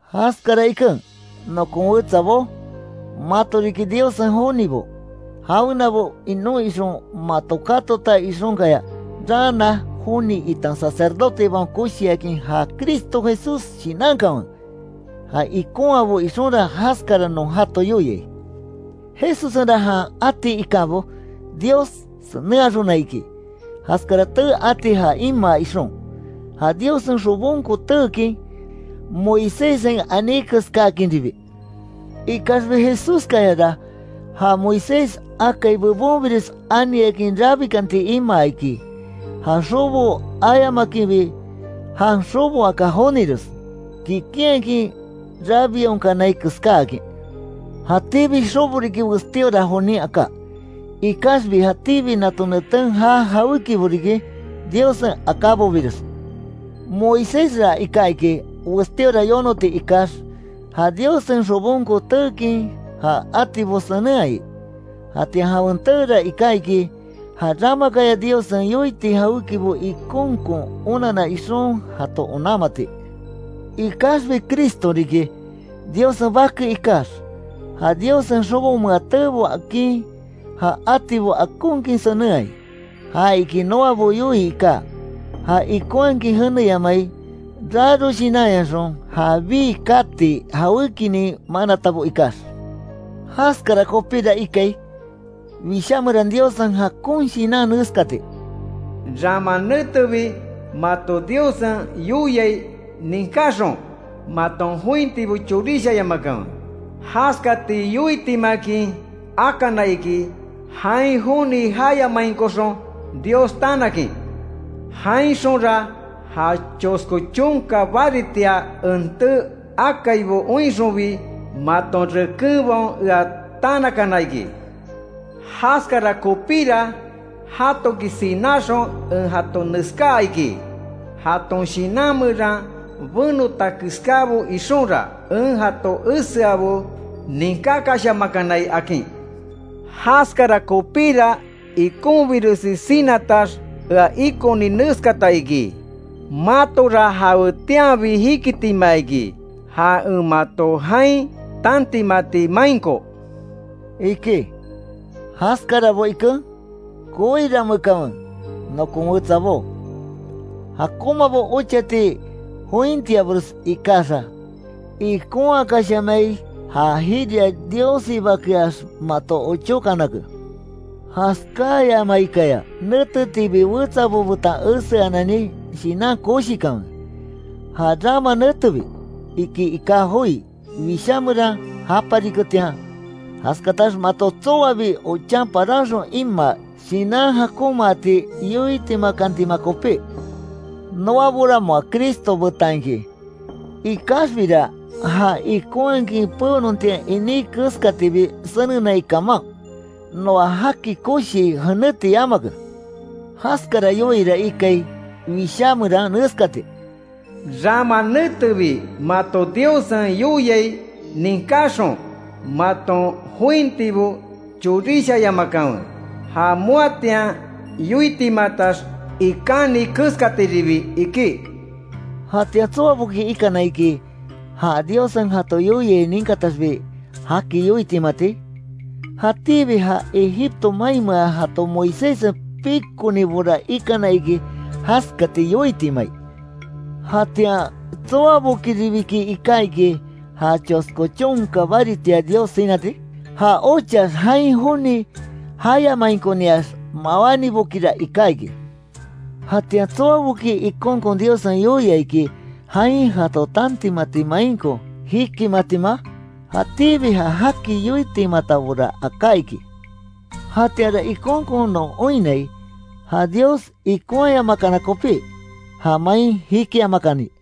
Jaskara iken, nokon wetsabó, mato riki Diossen jonibo, jawenabo inon ixon mato katota ixonkaya, raana joni itan Sacerdotebaon Koshiakin, ja Cristo Jesús shinankanwe, já ikonhaabo ixonra jaskara non jato yoiai. Jesussenra jan ati ikábo, Dios senenhaxona iki, jaskara tee ati ja imaa ixon, ja Diossen xobonko teekin, Moiséssen aní keskáakinribi. Ikaxbi Jesúskayara, ja Moisés akai bebonbires aniakin rabikanti imaa iki, ja xobo ayamakinbi, jan xoboaka jonires, kikinhakin rabionkanai keskáakin. Jatíbi xobo riki westíora jonin aká, ikaxbi jatíbi nato neten já jawékibo riki, Diossen akábobires. Moisésra iká iki, westíora yonoti ikax, ja Diossen xobonko teekin ja atibo senenhaai, jatian jawen teera iká iki, ja ramakaya Diossen yoiti jawékibo ikonkon onanna ixon, jato onanmati. Ikaxbi Cristo riki, Diossen Bake ikax, ja Diossen xobomea teebo akin, ja atibo akonkin senenhai, ja iki noabo yoii iká, já ikonhakin jeneyamai raro shinanyaxon, ja bii kati jawékinin manatabo ikax. Jaskara kopíra ikai, Wishá meran Diossen jakon Shinan neskati: “Rama netebi mato Diossen yoiai ninkáxon, maton jointibo chorishayamakanwe, jaskati yoitimakin akana iki, jain joni jayamainkoxon Dios tanakin. Jainxonra ja chosko chonka baritia, en tee akaibo oinxonbi, maton rekenbaon ea tanakana iki. Jaskara kopíra, jatoki sináxon en jato neskaa iki: ‘Jaton shinan meran benota keskábo ixonra, en jato eseabo ninkákashamakanai’, akin. Jaskara kopíra, ikonbiresi sinatax ea ikoni neskata iki: Matora jawetianbi jikitima iki, ja en mato jain tantimati mainko”, iki. Jaskarabo, iken, koirameekanwe nokon wetsabo, jakonmabo ochati jointiabores ikaxa, ikonhakashamai ja jiria Diossibakeax, mato ochókanake. Jaskáyamaikaya, netetiibi wetsabo betan eseanani, shinan koshikanwe, “ja rama netebi”, iki iká joi Wishá meran japariketian, jaskatax mato tsoabi ochan paranxon imaa, shinan jakonmaati yoitimakantima kopí. Noabora moa Cristo betan iki, ikaxbira já ikonhakin peonontian iní keskatibi senenai kaman, noa jaki koshii jenéti yamake. Jaskara yoiira ikai Wishá meran neskati: “Rama netebi mato Diossen yoiai ninkaxon, maton jointibo chorishayamakanwe ja moatian yoitimatax ikáni keskatiribi”, iki. ¿Jatian tsoaboki ikana iki, ja Diossen jato yoiai ninkataxbi jaki yoitimati? Jatíbi ja Egipto mainmea jato Moiséssen pikonibora ikana iki, jaskati yoitimai. ¿Jatian tsoabokiribiki iká iki, ja chosko chonka baritia Dios sinati? Ja ochax, jain joni jayamainkoniax mawánibokira iká iki. ¿Jatian tsoaboki ikonkon Diossen yoia iki, jain jato tantimati mainko jikimatima? Jatíbi ja jaki yoitimatabora aká iki. Jatianra ikonkon non oinnai, ja Dios ikonhayamakana kopí, ja main jikiamakani.